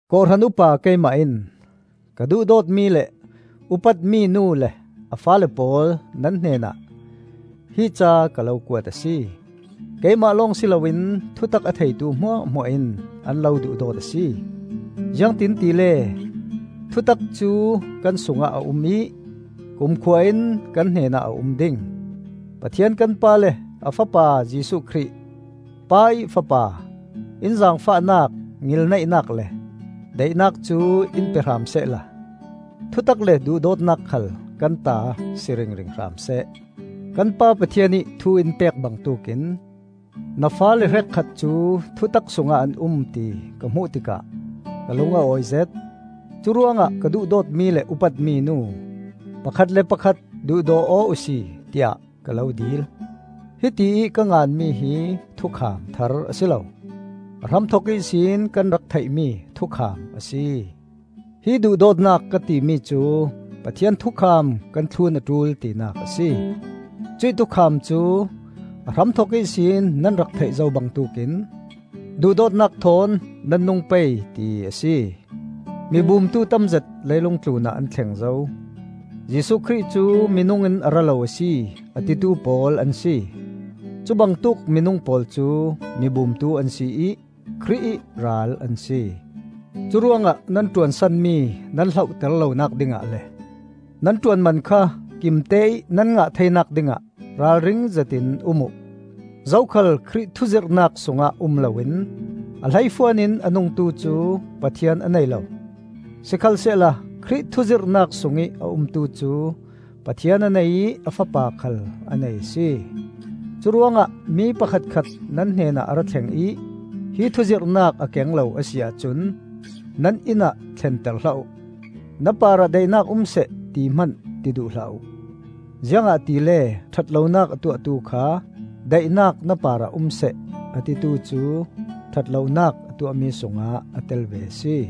Kawhhran upa keimah in ka duhdawtmi le upatmi Nu le a faale pawl nan hnenah hi ca ka lo kuat a si. Keimah lawng si loin thutak a theitu hmuahhmuah in an lo duhdawt a si. Ziangtiin tile thutak cu kan sungah a um ih kumkhua in kan hnenah a um ding. Pathian kan Pa le a fapa Jesuh Khrih, Pa ih Fapa, in zaangfahnak, ngilneihnak le daihnak cu in pe hram sehla thutak le duhdawtnak khal kan ta si ringring hram seh. Kan Pa Pathian ih thu in pek bangtuk in na faale hrekkhat cu thutak sungah an um ti ka hmuh tikah ka lung a awizet. Curuangah ka duhdawtmi le upatmi Nu, pakhat le pakhat duhdaw aw uhsi tiah ka lo dil. Hitiih ka nganmi hi thukham thar a si lo; a hramthok ihsin kan rak theihmi thukham a si. Hi duhdawtnak ka timi cu Pathian thukham kan thlun a ṭul tinak a si. Cuih thukham cu, a hramthok ihsin nan rak theih zo bangtuk in, duhdawtnak thawn nan nung pei, ti a si. Mibumtu tamzet leilung tlunah an thleng zo, Jesuh Khrih cu minung in a ra lo a si, a titu pawl an si! Cu bangtuk minung pawl cu mibumtu an si ih Khrih ih Ral an si. Curuangah nan ṭuan sanmi nan hlohter lonak dingah le nan ṭuanman kha kimteih nan ngah theinak dingah ralringzet in um uh. Zokhal Khrih thuzirhnak sungah um loin a hleifuan in a nungtu cu Pathian a nei lo. Sikhalsehla Khrih thuzirhnak sungih a umtu cu Pathian a nei ih a Fapa khal a nei a si. Curuangah mi pakhatkhat nan hnenah a ra thleng ih hi thu zirhnak a keng lo a si ahcun nan inn ah thlenter hlah uh. “Na parah daihnak um seh,” ti hman ti duh hlah uh. Ziangahtile ṭhat lonak a tuahtu kha, “Daihnak na parah um seh,” a titu cu ṭhat lonak a tuahmi sungah a tel ve a si.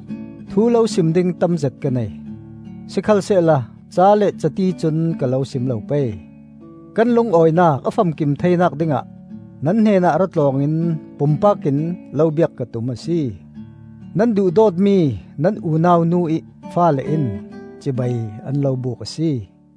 Thu lo sim ding tamzet ka nei, sikhalsehla ca le cati cun ka lo sim lo pei. Kan lungawinak a famkim theinak dingah nan hnenah ra tlawng in pumpak in lo biak ka tum a si. Nan duhdawtmi nan unau Nu ih faale in cibai an lo buk a si.